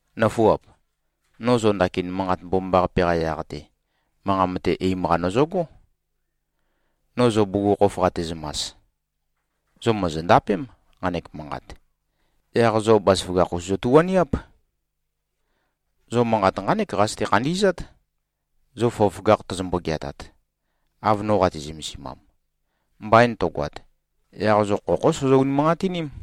Nǿfuap! No zo ndakin Manqat Mbomambaqape-qa yaq-te, manqa mate eim-qa nøzøgó, no zo bugukhokhof qatezømas. Zo mòzondapém, nqanek manqat. Yaq zo bazaføgakh-us zøtu꞉-waniáp. Zo manqat nqánek qazøte-khandi꞉zát, zo føgøføgakh tozombo-geatat, av no qate-zømesimam. Mbain tøgoat, yaq zo khokhó sozo-unimanqatiním.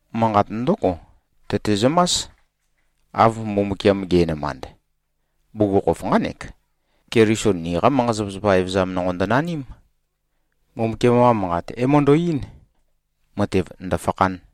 Manqat ndǿgo tøtezømás, av Mbumbukiam ge꞉nømand. Bugukhokhof nqánek: Keliso niqa manqa-zapazapa evøzam nonqo ndønaním. Mbumbukiam-qa Manqat é-møndo꞉-eín, matev ndø̀fakhān.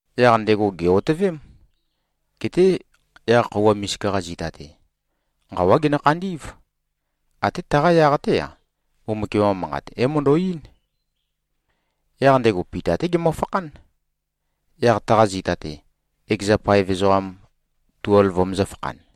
Yaq ndego gè-otøvém. Geté yaq khøuwa misika-qa zita-te, nqawá genø-khandí꞉v. Até taqa yaq-té-a, Mbumbukiam-qa Manqat é-møndo꞉-eín. Yaq ndego Pita-té gemøfakhán, yaq taqa zita-te, ekeza paev ezoqam tuelv vømøzø̄-fakhan.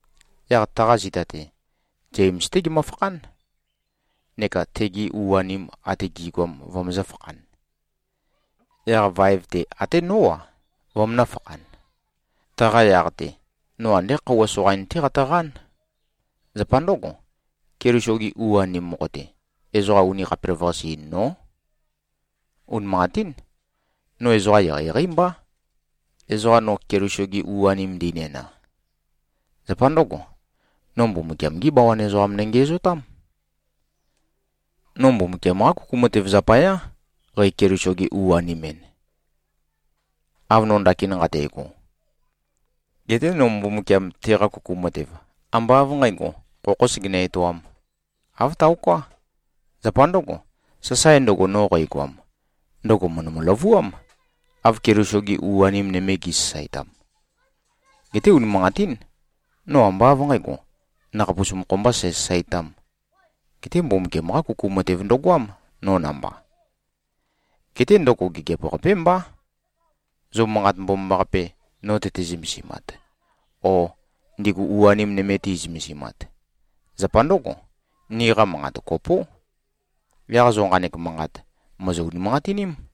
Yaq taqa zita-te, Zems-té gemøfakhán, neka tegi u-anim ate gi꞉goam vømøzø̄-fakhan. Yaq vaev-te, até nó-a, vømønø̄-fakhan. Taqa yaq-te, no andé khøuwa soqain-té qatøqán. Zapa ndǿgo, Keliso-gi u-anim mokho-te, ezoqa uni khapelavøqase-in nó. Unimanqatín, no ezoqa eqeieqeí mbá, ezoqa no Keliso-ge u-anem ndinæna. Zapa ndǿgo, no Mbumbukiam-gí bawan ezoqam nøngiæzotám. No Mbumbukiam-qá kuku matev zapayá, qæ-Keliso-ge-u-anem-en, av no ndakin nqate꞉go. Geté no Mbumbukiam teqa kuku matev, ambá av nqǣgo, khokhō segenø-etoām. Āv taoká. Zapa ndǿgo, sasae ndøgo, no qægoam, ndøgo mø̀ndømø-løvuám, av Keliso-gi u-anim nøme gi꞉sasaetam. Geté unimanqatín. No ambá av nqǣgo, nøkhapus mokho mbā sæsasaetām. Geté Mbumbukiam-qá kuku matev ndøgoám, no namba. Geté ndøgo gigiap-qapé mbá, zo Manqat Mbomambaqape nō tøte-zømesimat o ndigu u-anim nøme ti꞉zømesimat. Zapa ndǿgo, niqa manqat kopó. Yaq zo nqanek manqat mòzo-unimanqatiním.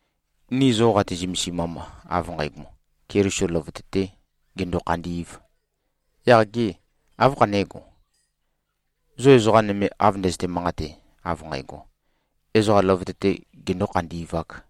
Ni zo qati-zømesimam, av nqægo, Keliso løvøte-tē gendo-khandī꞉v, yaq gê, áv khané꞉go, zo ezoqa nøme av ndøzøte-manqate, av nqægo, ezoqa løvøte-te gendō-khandi꞉vāk?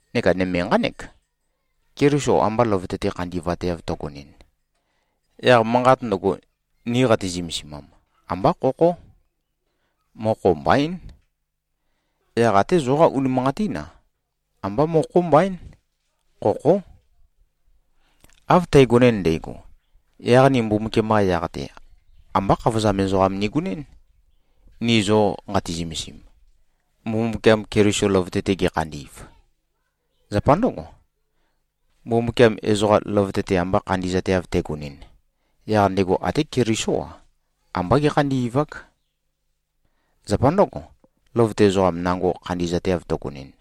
Neka nøme nqánek: Keliso amba løvøte-te khandi꞉vateav tøgonɨn, yaq manqat ndøgo, ni qati-zømesimam, ambá khokhó. Mokho mbaín. Yaq até zoqá unimanqatín-a, ambá mokho mbaín. Khokhó. Av tægonɨn ndægo, yaq ni Mbumbukiam-qa yaq-te, ambá khavozam ezoqam nigonɨ́n, ni zo nqati-zømesim, Mbumbukiam Keliso løvøte-te gekhandi꞉v. Zapa ndǿgo, Mbumbukiam ezoqa løvøte-te amba khandi꞉zateav tegonɨn, yaq ndego até Kelisó-a, ambá gékhandi꞉vák. Zapa ndǿgo, løvøte ezoqam nango khandi꞉zateav tøgønɨn,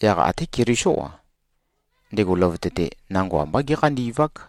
yaq até Kelisó-a, ndego løvøte-te nango ambá gékhandi꞉vák.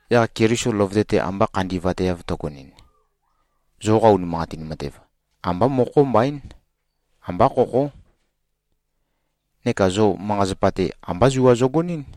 Yaq Keliso løvøte-te amba khandi꞉vateav tøgonɨn, zoqa unimanqatin matev, ambá mokho mbaín. Ambá khokhó. Neka zo manqa-zapa-te, ambá zua zogonɨ́n.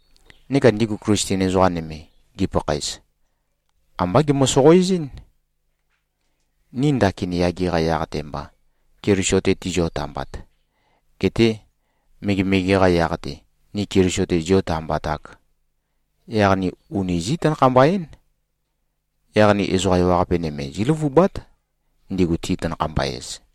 Neka ndigu Klisten ezoqa nøme, gipakhaez, ambá gemø-soqoezɨ́n. Ni ndakin yage-qa yaq-te mba, Keliso-te tizio-tambat, getē megemege-qa yaq-te, ni Keliso-te ziō-tambatāk, yaq ni uni zí꞉-tanakhamba-én. Yaq ni ezoqa ewaqape nøme zíløvubát, ndigu ti-tanakhamba-ez.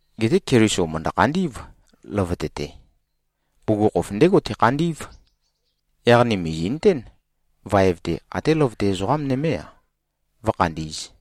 Geté Keliso mø̀ndø-khandí꞉v, løvøte-te. Bugukhokhof ndégo tekhandí꞉v. Yaq ni mìzi꞉nøtén, vaev-te até løvøte ezoqa nømé-a, vǿkhandī꞉z.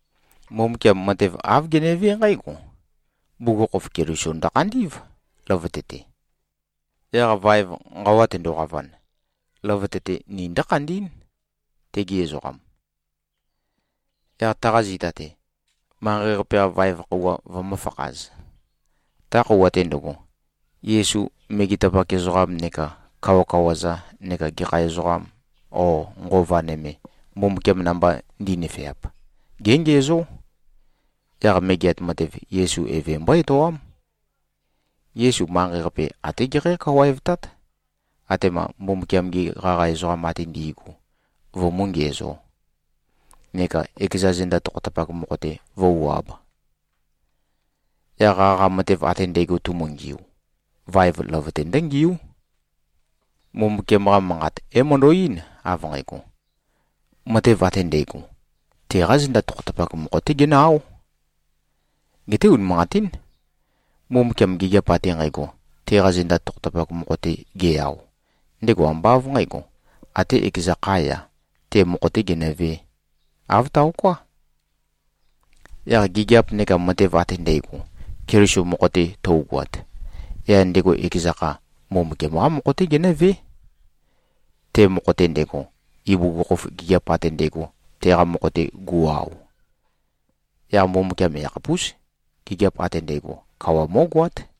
Mbumbukiam matev āv genevé nqǽgo: Bugukhokhof, Keliso ndøkhandí꞉v, løvøte-te. Yaq vaev, nqawa tendoqavan, løvøte-te ni ndǿkhandí꞉n, tegi ezoqam. Yaq taqa zita-te, manqei-qape-qa vaev khøuwa vømǿfakhāz. Ta khøuwa-te ndøgo, Yesu megetapak ezoqam neka kawakawa-za neka gekha ezoqa o nqova nøme, Mbumbukiam namba ndi꞉nøfeap, géngiæzó. Yaq megeat matev, Yesu Eve mbó-etoám. Yesu manqei-qape até gekhǽ-kawaevtát, atema Mbumbukiam-gi qaqa ezoqam ate ndi꞉gu vømú-ngiæzō, neka ekeza zenda tokhotapak mokho-te vǿu-āb. Yaq qaqa matev ate ndægo tumungiu, vaev løvøte ndǿngíu. Mbumbukiam-qa Manqat é-møndo꞉-eín, av nqægo, “Matev ate ndægo, teqá zenda tokhotapak mokho-té genø-áo.” Geté unimanqatín. Mbumbukiam gigiap ate nqægo, teqa zenda tokhotapak mokho-te ge-ao, ndego ambá av nqǣgo, até ekeza khá-ya, te mokho-tē genøvē. Āv taoká. Yaq gigiap neka matev ate ndægo, Keliso mokho-te tøugoat, yaq ndego ekeza kha, Mbumbukiam-qá mokho-té genǿvé, te mokho-te ndego, ibugukhokhof gigiap ate ndægo teqa mokho-te gu꞉-ao. Yaq Mbumbukiam yakhapús, gigiap ate ndægo, kawa mó꞉goát.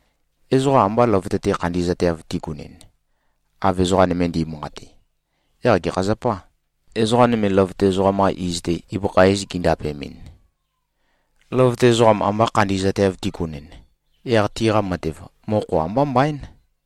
Ezoqa amba løvøte-te khandi꞉zateav tigunɨn, av ezoqa nøme ndi꞉manqate, yaq gekha zapâ, ezoqa nøme løvøte ezoqam-qa iz-te, ibøkha iz gindapemɨn? Løvøte ezoqam amba khandi꞉zateav tigunɨn, yaq tiqa matev, mokho ambá mbaín.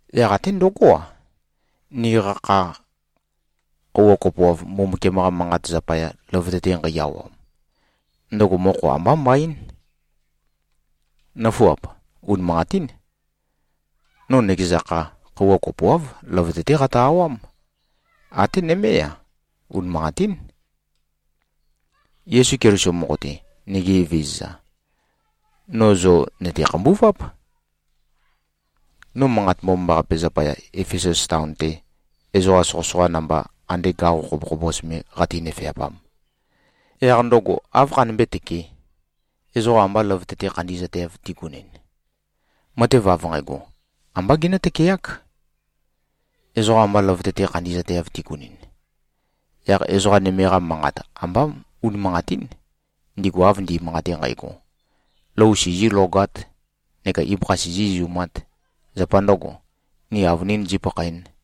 Yaq até ndøgó-a, niqa kha khøuwa kopoav, Mbumbukiam-qa Manqat zapaya, løvøte-te nqei-awam, ndøgo mokho ambá mbaín. Nǿfuap! Unimanqatín. No nøkeza kha, khøuwa kopoáv, løvøte-té qatø-awám. Até nømé-a, unimanqatín. Yesu Keliso mokho-te, nigi Evezøza, no zo nø̀te-khambuváp. No Manqat Mbomambaqape zapaya, Efesus taon-te ezoqa soqøsoqa namba ande gaqo khobokhobos me qate-nøfe꞉pam, yaq ndøgo áv khanømbé-tøkē, ezoqa amba løvøte-te khandi꞉zateav tigunɨn? Matev av nqægo, ambá genǿ-tøkeák. Ezoqa amba løvøte-te khandi꞉zateav tigunɨn, yaq ezoqa nøme-qa manqat ambá unimanqatín, ndigu av ndi꞉manqate nqægo, “Lou sizīlogāt neka ibøkha sizī-izumāt. Zapa ndø̄go, ni avønīn zīpakhaēn.”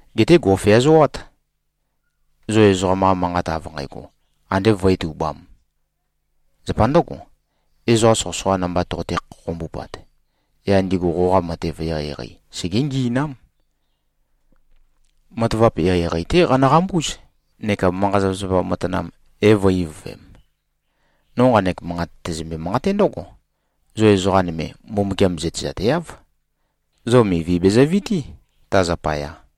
Geté gò꞉feazoát. Zo ezoqam-qa manqat av nqægo andé vǿe-tubām. Zapa ndǿgo, ezoqa soqøsoqa namba toqote-khokhombupat, yaq ndigu qoqa matev eqeieqei segé-ngi꞉nám. Matavap eqeieqei-té qanøqambúz neka manqa-zapazapa matanam é-vø̄-ivøvem. No nqanek manqat tæzømbe-manqaté ndǿgo: Zo ezoqa nøme, Mbumbukiam zøtezateáv. Zo mivi bezøvití, ta zapaya.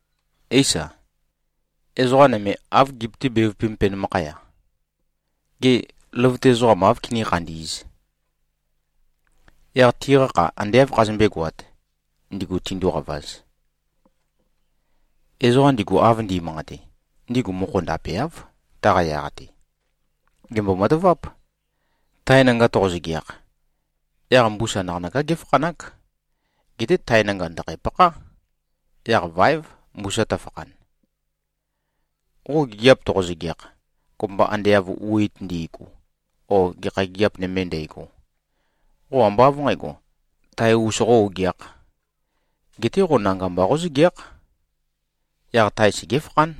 Éisa, ezoqa nøme áv gipøtí-bevupēm penømakhaya, “Gê, løvøte ezoqam áv kiní-khandī꞉z? Yaq tiqa kha ande áv khazømbé-goāt, ndigu tinduqavaz?” Ezoqa ndigu av ndi꞉manqate, ndigu mokho ndapeáv, taqa yaq-te. Gèmbo-mataváp. Tae nanga toqo-zøgeakh, yaq mbusa naqanøká géfakhanák. Geté tae nanga ndø̀khæ-pakhá. Yaq váev mbusa tøfakhan. Qo gigiap toqo-zøgeakh, kopømba ande av wit ndi꞉gu o gekha gigiap nøme ndægo, qo ambá av nqǣgo, tae-us qó-ogeākh. Geté qo nanga mba qózøgeákh. Yaq tae segéfakhán.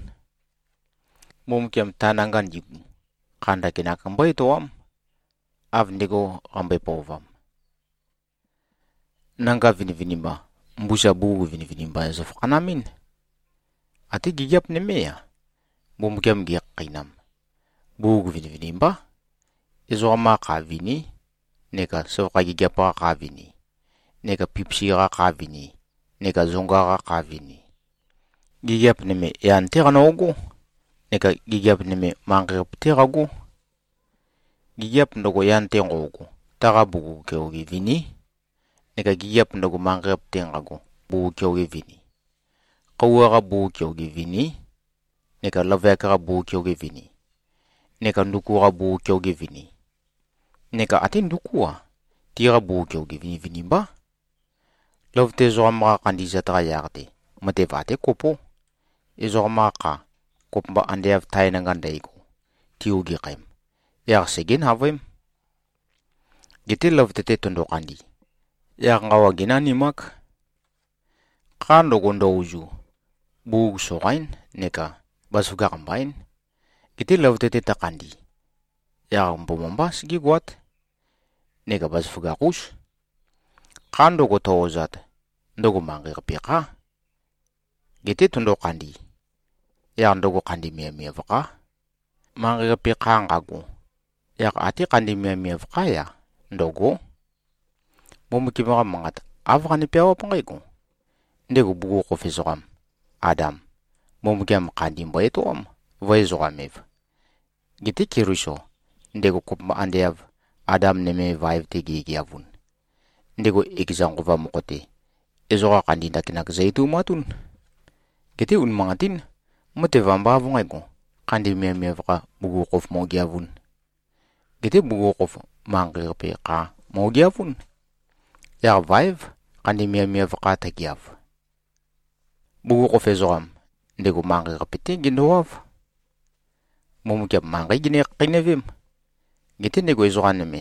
Mbumbukiam, ta nanga ndigu, kha ndakinak mbó-etoám, av ndego qambøe-pøovam. Nanga vinivinimba, mbusa bugug vinivinimba zøfakhanamɨ́n. Até gigiap nømé-a, Mbumbukiam gekhakheinam, bugug vinivinimbá. Ezoqam-qa kha viní neka søvakha gigiap-qa kha vini, neka pipisi-qa kha vini neka zonga-qa kha vini. Gigiap nøme, yan-té qano꞉gó neka gigiap nøme manqei-qape-té qagó. Gigiap ndøgo, yan-te nqo꞉go, taqa bugug keoge viní, neka gigiap ndøgo, manqei-qape-te nqago, bugug keoge vini. Khøuwa-qa bugug keoge viní, neka løvøyak-qa bugug keoge vini, neka nduku-qa bugug keoge vini. Neka até ndukú-a, tiqa bugug keoge vinivinimbá. Løvøte ezoqam-qa khandi꞉zat-qa yaq-te, matev até kopó. Ezoqam-qa kha, kopømba ande av tae nanga ndægo, ti-ogeakhem, yaq segé-navøém. Geté løvøte-te tøndo-khandi, yaq nqawa génanimák. Kha ndøgo, ndø-ozu, bugug soqaín neka bazaføgakh mbaín. Geté løvøte-te tøkhandi, yaq mbomambá segégoát neka bazaføgakh-ús. Kha ndøgo, tø-ozat, ndøgo manqei-qape khá. Geté tøndo-khandi, yaq ndøgo khandi miavmiav khá. Manqei-qape kha nqago, yaq até khandi miavmiav khá-ya, ndø̂gó. Mbumbukiam-qa Manqat āv qane-peawáp nqǽgo, “Ndego bugukhokhof ezoqam, Adam, Mbumbukiam khandi mbo-etoám, vø̄-ezoqam-ev.” Geté Keliso, ndego kopømba ande av Adam nøme, vaev-te gegeavun, ndego ekeza Nqova mokho-te, ezoqa khandi ndakinak zø-etoumatún. Geté unimanqatín. Matev ambá av nqǣgo, khandi miavmiav kha bugukhokhof mo꞉geavūn. Geté bugukhokhof, manqei-qape kha mo꞉geavún. Yaq vaév, khandi miavmiav kha tøgeav. Bugukhokhof ezoqam, ndego manqei-qape-té gendowáv. Mbumbukiam manqeí gene-khakheinøvém. Geté ndego ezoqa nøme,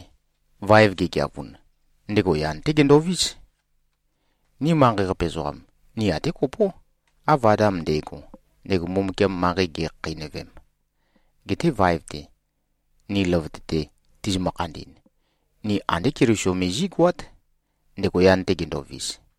vaev gegeavun, ndego yan-té gendovís. Ni manqei-qape ezoqam, ni até kopó, av Adam nde꞉go, ndego Mbumbukiam manqei ge꞉khakheinøvem. Geté vaev-te, ni løvøte-te tizimø-khandi꞉n, ni andé Keliso me zí꞉goát, ndego yan-te gendovis.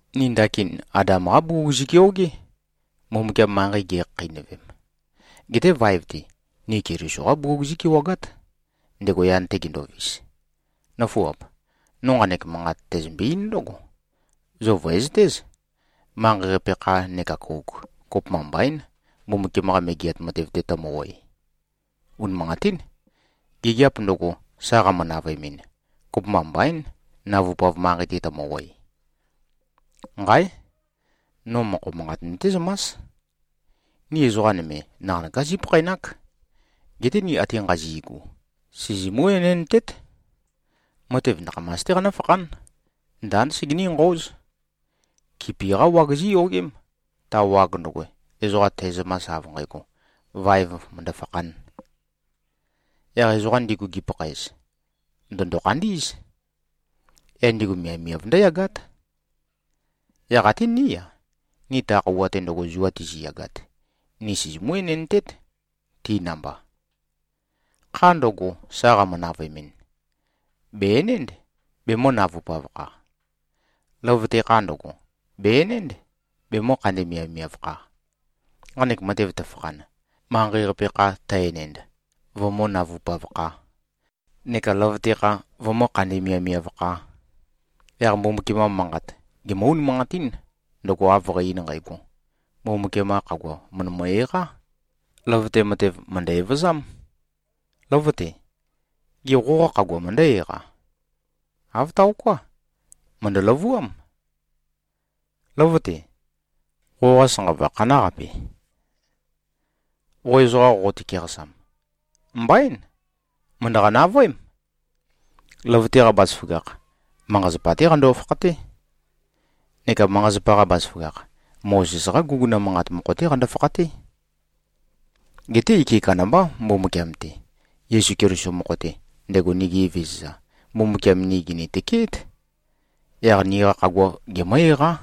Ni ndakin Adam-qá bugug zi꞉keogé, Mbumbukiam manqei ge꞉khakheinøvem. Geté vaev-te, ni Keliso-qá bugug zí꞉kewagát, ndego yan-te gendovis. Nǿfuap! No nqanek manqat tæzømbe-eín ndǿgo: Zo vø̀ezøtéz. Manqei-qape kha neka kouk, kopømba mbaín, Mbumbukiam-qa Megeat Matev-te tømø-oe. Unimanqatín. Gigiap ndøgo, sa qamø-navøemɨn, kopømba mbaín, navupav manqei-te tømø-oe. Nqáe! No mokho manqat nøtézømás: Ni ezoqa nøme, naqanøká zípakhaenák. Geté ni ate nqazi꞉gu, sizimú-enendtét. Matev nakhamas-té qanǿfakhán. Ndánd segení-nqøóz. Kipi-qá wag zíyogém, ta wag ndøgo, ezoqa tæzømas, av nqægo, vaev mø̀ndø-fakhān. Yaq ezoqa ndigu gipakhaez, ndø̀ndo-khandí꞉z. Yaq ndigu miavmiav ndǿyagát. Yaq até ní-a, ni ta khøuwa-te zua tiziyagat, ni sizimú-enendtét, ti namba. Kha ndøgo, sa qamø-navøemɨn, bè-enénd, bemø̄-navupav-kha. Løvøte kha ndøgo, bè-enénd, bemø̄-khandi-miavmiav-kha. Nqanek matev tøfakhan, manqei-qape kha tø-enend, vømǿ-navupav-khā neka løvøte kha vømǿ-khandi-miavmiav-khā, yaq Mbumbukiam-qa Manqat gemǿ-unimanqatín, ndøgo av qæ-ein nqægo, “Mbumbukiam-qa khagua, mø̀ndømø-eqá. Løvøte matev, mø̀ndø-evøzám. Lǿvøte! Gê, qoqa khagua møndǿ-eqa? Āv taoká. Mø̀ndø-løvuám. Lǿvøte! Qoqa sanqava khanáqape, qo ezoqa qoqote-keqasam? Mbaín. Mø̀ndøqa-navøém!” Løvøte-qa bazaføgakh, manqa-zapa-té qando-fakhaté. Neka manqa-zapa-qa bazaføgakh, Mozes-qá guguna manqat mokho-té qando-fakhaté. Geté ike kandambá, Mbumbukiam-te. Yesu Keliso mokho-te, ndego nigi Evezøza, Mbumbukiam ni gìni-tøkeét. Yaq niqa khagua gemǿ-eqá.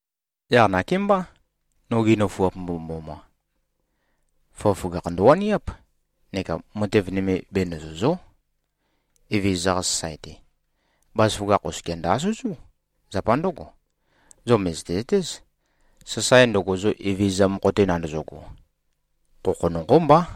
Yaq nakémbá, nogi nøfuap mbomømboma! Føgøføgakh ndøwaniáp neka matev nøme benøzø̀zo᷄. Evezøza-qa sasae-te, bazaføgakh oskia ndø-asøzú. Zapa ndǿgo, zo mø̀zøte-zøtéz, sasae ndøgo, zo Evezøza mokho-te nandozogo, khokho nonqó mbá.